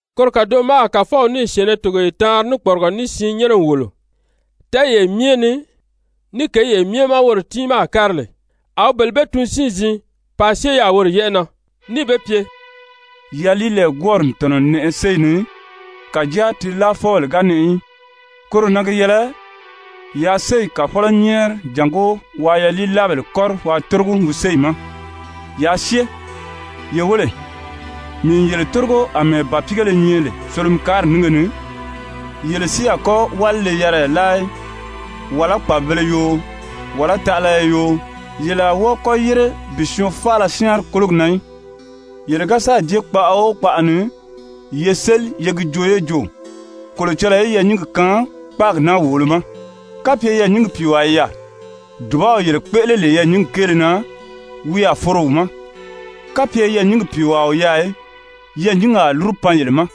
Koro kàdoʔo ma a Kàfɔw níì syɛ̀ɛnnɛ togoye taanri ní kpɔrigɔ ní siin nyɛ́nɛ n wòlo, tɛ́ɛyee myɛ ni, ní kěyi myɛ ma woro tiimaa a kári lè, a wi bele bee tun siin-ziin paa syée yaà woro yɛ́ʔɛ na, níì be pye: «Yaliilɛɛgwɔɔri n tɔ̀nɔ n nɛʔɛ séyi ni, kàjáa ti láafɔbèle ga nɛʔɛ í. Koro na gi yɛlɛ yaa séyi Kàfɔlɔ nyɛ́ɛri jàngó waa yaliilaabèle kɔ́ri waa tórogi wi séyi ma. Yaa syée. Ye wéle, mii n yele tórigo àmɛɛ bàpiigéle nyɛ lè solomikaari nínge ni. Yele si a kɔ́ wálile-yariya láa í, wàlá kpàbibēle yoo, wàlá taʔalaya yoo, yele a wɔ́ɔ kɔ́ yére bi syɔɔn faala syáanri kólogi na í. Yele ga sáà jée kpaʔa o kpaʔa ni, ye séli ye gi joo yé jo: ‹Kolocɔlɔɔ í yɛɛ̀nyingi kaan kpáagi naa wòolo ma!› Kapye yɛɛ̀nyingi pìiwaa i yaà, dùbaw yele kpéʔele lè yɛɛ̀nyingi kéele na, wi a foro wi ma. Kapye yɛɛ̀nyingi pìiwaa o yaà í, yɛɛ̀nyingi a lúru pan yele ma.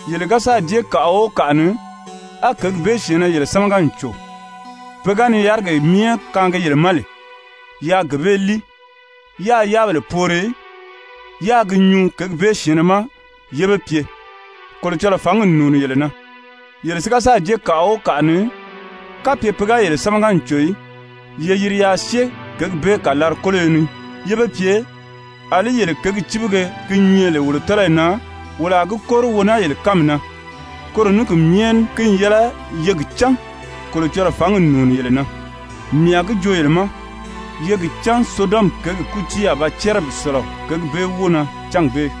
Yele ga sáà jée kàʔa o kàʔa ni, á kěgi bee syɛ̀ɛnnɛ yele sámaga n cò, pe ga ni yárigee myɛ kaangi yele ma lè, yaa gee bee líi, yáā yáabèle poori, yáā gi nyuu kěgi bee syɛ̀ɛnnɛ ma yé be pye: ‹Kolocɔlɔɔ fǎngi n nùuni yele na.› Yele si ga sáà jée kàʔa o kàʔa ni, kapye pe ga yele sámaga n cò í, ye yiri yaa syée kěgi bee kàlari-kóloyo ni yé be pye: ‹Alí yele kěgi cíbige ki nyɛ lè wolo tɔ́lɔyi na, wolo a gi kóri wo naa yele kánmi na. Koro ní ki myɛ ní ki n yɛlɛ ye gi cán Kolocɔlɔɔ fǎngi n nùuni yele na.› Mii a gi joo yele ma, ye gi cán Sodɔmi kěgi kútii a ba cɛ́rɛ bi sɔ̀lɔ kěgi bee wóo na cángi bee.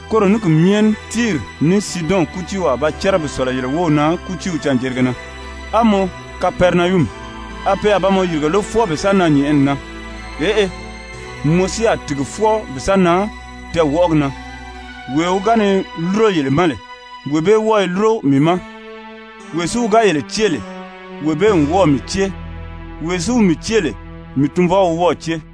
Koro ní ki myɛ ní Tiiri ní Siidɔn kútiiw a ba cɛ́rɛ bi sɔ̀lɔ yele wów na kútiiw canjerige na. A mɔ, Kapɛrinayumi, a pe a ba mɔ yìrige lé fwɔɔ bi sa nan nyɛ̀ʔɛni na? Eʔe, mɔ si a tìgi fwɔɔ bi sa nan tɛɛwɔʔɔgi na. Wee wi ga ni lúro yele ma lè, wee bee wɔ́ɔ i lúro mii ma. Wee si wi ga yele cée lè, wee bee n wɔ́ɔ̀ mii cée. Wee si wi mii cée lè, mii Tunvɔw wi wɔ́ɔ̀ cée.»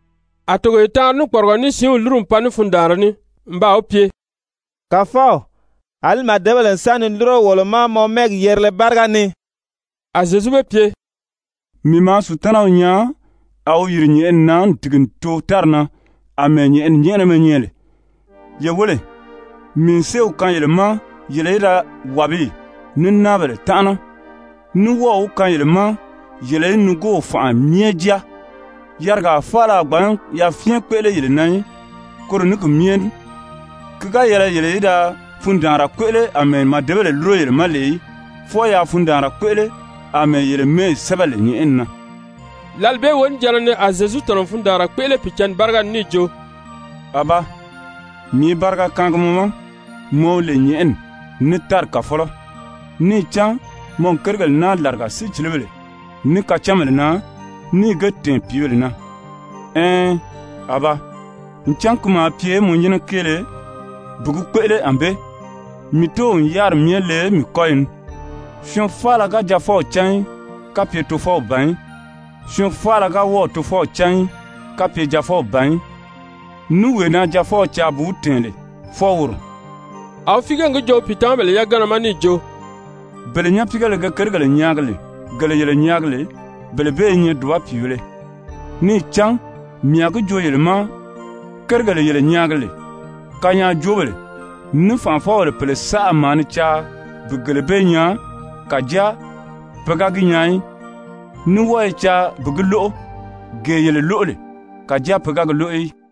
A togoye taanri ní kpɔrigɔ ní siinw lúru n pan ní fundaanra ní n baa wi pye: «Kàfɔw, àlí màdebèle n sa ni lúro wolo ma mɔ mɛ́ɛgi yerile báriga ni.» A Zyezu be pye: «Mii maa Sutanaw nyaa a wi yìri nyɛ̀ʔɛni na n tìgi n too tári na àmɛɛ nyɛ̀ʔɛni nyɛ́ʔɛnɛmɛ nyɛ lè. Ye wéle, mii n séew kaan yele ma yele í da wàbiyi, ní náabèle tánʔana, ní wɔ́ɔ̀ wi kaan yele ma yele í nigoow fànʔa myɛ jáa, yarigaa faala a gbǎn yafyɛn kpéʔele yele na í. Koro ní ki myɛ ní ki ga yɛlɛ yele í da fundaanra kpéʔele àmɛɛ màdebèle lúro yele ma lè í, fwɔɔ yaa fundaanra kpéʔele àmɛɛ yele mɛ́ɛyi sɛ́bɛ lè nyɛ̀ʔɛni na.» Lǎli bee wonijanna ni a Zyezu tɔ̀nɔ n fundaanra kpéʔele Pìicǎnni báriga ni níì jo: «Abaa, mii i bariga kaangi mɔ ma, mɔ wi lè nyɛ̀ʔɛni, ní tári Kàfɔlɔ, níì cán mɔ n kérigèle naa làriga sícilibèle, ní kacánbèle na, níì ge tɛ̀ɛn pìíbèle na. Ɛɛn, Abaa, ncan ki maa pye mɔ nyɛ́nɛ kéele bi gi kpéʔele ànbée. Mii Tóow n yáriri myɛ le mii kɔ́yi ni. Syɔɔn faala ga Jaafɔw cán í, kapye Tofɔw ban í. Syɔɔn faala si ga wɔ́ɔ̀ Tofɔw cán í, kapye Jaafɔw ban í, ní wee na Jaafɔw caa bi wi tɛ̀ɛn lè, fwɔɔ woro.» A wi fíige n gi joo wi pìitamabèle yagana ma níì jo: «Bele nyapiigéle ge kérigèle nyaagi lè, gele yele nyaagi lè, bele bee i nyɛ dùba pìibēle. Níì cán mii a gi joo yele ma, kérigèle yele nyaagi lè, kanyaajoobèle ní fànʔafɔbèle pèle saʔa maa ni caa bi gele bee nyaa, kàjáa pe ga gi nyaa í, ní wɔ́ɔ i caa bi gi lóʔo, gee yele lúro lè, kàjáa pe ga gi lóʔo í.»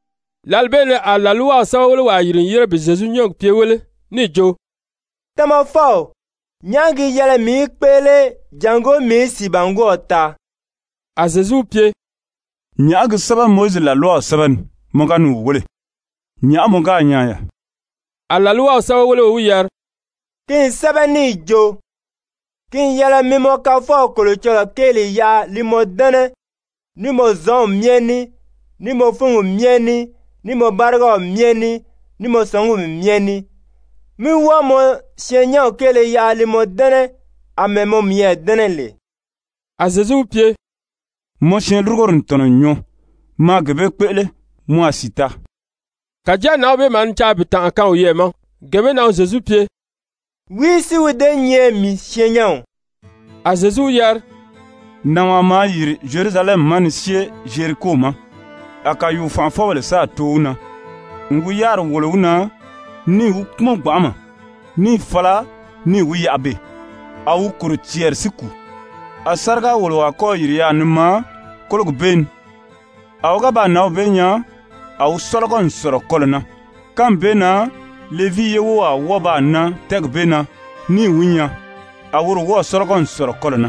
Lǎli bee ni a làlwaw sɛ́bɛwelewaa yìri n yére bi Zyezu nyɔ́ɔgi pye wéle níì jo: «Tamafɔw, nyàʔá gi yɛlɛ mii í kpéʔele jàngó mii í sìibangwɔɔw taa?» A Zyezu wi pye: «Nyàʔá gi sɛ́bɛ Mowizi làlwaw sɛ́bɛ ni? Mɔ ga ni wi wéle, nyàʔá mɔ gáà nyaa yaà?» A làlwaw sɛ́bɛweleo wi yari: «Ki n sɛ́bɛ níì jo: ‹Ki n yɛlɛ mi mɔ Kafɔw Kolocɔlɔɔ kéeli yaʔa li mɔ dɛ́nɛ ní mɔ zɔnw myɛ ní, ní mɔ fúngi myɛ ní, ní mɔ bárigaw myɛ ní, ní mɔ sɔngumi myɛ ní. Mí wɔ́ɔ mɔ syɛɛnnyɛnw kéele yaʔa li mɔ dɛ́nɛ àmɛɛ mɔ miyɛɛ dɛ́nɛ lè.›» A Zyezu wi pye: «Mɔ syɛɛnlurugori n tɔ̀nɔ n nyɔɔ. Maa gee bee kpéʔele, mɔ a sìi taa.» Kàjáa nǎnw bee maa ni caa bi tànʔa kaan wiyɛɛ ma. Gee bee na wi Zyezu pye: «Wìí si wi déē nyɛ mii syɛɛnnyɛnw?» A Zyezu wi yari: «Nànwaa maa yìri Zyerusalɛmi ma ni syée Zyeriko ma. A kàyuu-fànʔafɔbèle sáà too wi na n wi yáriri wòlo wi na, níì wi kpúmɔn gbanʔama, níì fala níì wi yaʔa beè, a wi kòro cɛɛri si kùu. A sáriga-wòlowaa kɔ́ɔ̀ yìri yaà ni maa kólogi bee ni. A wi ga baa nǎnw bee nyaa, a wi sɔ́lɔgɔ n sɔ̀lɔ kɔlɔ̀ na. Kánmi bee na Levii ye wówaa wɔ́ɔ baa nan tɛ́ɛgi bee na níì wi nyaa, a woro wɔ́ɔ̀ sɔ́lɔgɔ n sɔ̀lɔ kɔlɔ̀ na.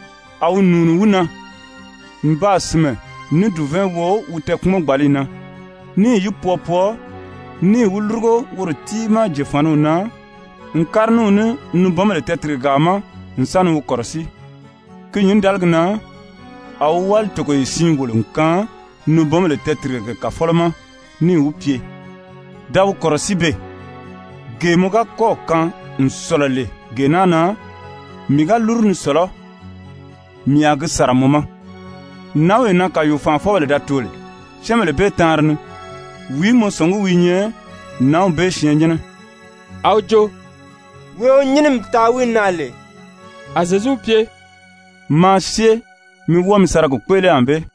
A wi nùuni wi na, n baa sìnmɛ ní dùvɛɛn wo wi tɛɛ̀kpumɔ-gbàliyi na, níì yi pwɔɔ pwɔɔ, níì wi lúrugo woro tiimaa jòfaniw na n kári ní wi ní nibɔnbèle tɛɛtìrigegaa ma n sa ni wi kɔ̀rɔsíi. Ki nyǐndaligi na a wi wáli togoye siin wòlo n kaan nibɔnbèle tɛɛtìrigege kàfɔlɔ ma níì wi pye: ‹Da wi kɔ̀rɔsíi beè, gee mɔ ga kɔ́ɔ̀ kaan n sɔ̀lɔ lè gee naa na, mii ga lúru ni sɔ̀lɔ́, mii a gi sàra mɔ ma.› Nǎnwee na kàyuu-fànʔafɔbèle da too lè, syɛ́ɛnbèle bee taanri ni, wìí mɔ sɔ̀ngí wi i nyɛ nǎnw bee syɛɛnnyɛnnɛ?» A wi jo: «Wee wi nyínimi taa wi na lè.» A Zyezu wi pye: «Maa syée mi wɔ́ɔ mi sa ra gi kpéʔele ànbée.»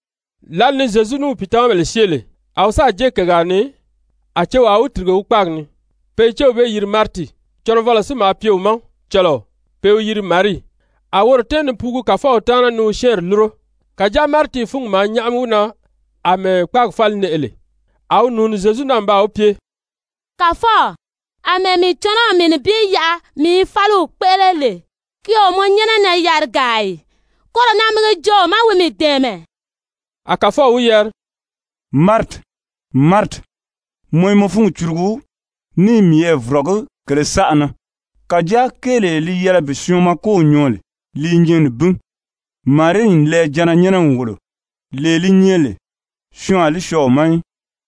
Lǎli ni Zyezu ní wi pìitamabèle syée lè, a wi sáà jée kègaa ni, a cewaa wi tìrige wi kpáagi ni, pe i céw bee yiri Mariti. Cɔnɔvɔlɔ si maa pye wi ma cɔlɔɔ, pe i wi yiri Marii, a woro tɛ́ɛn ni puugu Kàfɔw taana ni wi syɛ́ɛnri lúro. Kàjáa Mariti fúngi maa nyáʔami wi na àmɛɛ kpáagi fáli nɛʔɛ lè. A wi nùuni Zyezu na n baa wi pye: «Kàfɔw, àmɛɛ mii cɔnɔw mii nibin yaʔa mii i fáliw kpéʔele lè, ki o nyɛ mɔ nyɛ́nɛ na yarigaa ì? Koro na mi gi joo wi ma wi mii dɛ̀ɛmɛ.» A Kàfɔw wi yari: «Mariti, Mariti, mɔ i mɔ fúngi curugu, ní i miyɛɛ vɔ̀rɔgí kèlē saʔa na. Kàjáa kéelee li yɛlɛ bi syɔɔn makow nyɔɔ lè, li i nyɛ nibin. Marii n lɛɛjanna nyɛ́nɛ n wòlo, lee li nyɛ lè syɔɔn a li syɔɔ wi ma í.»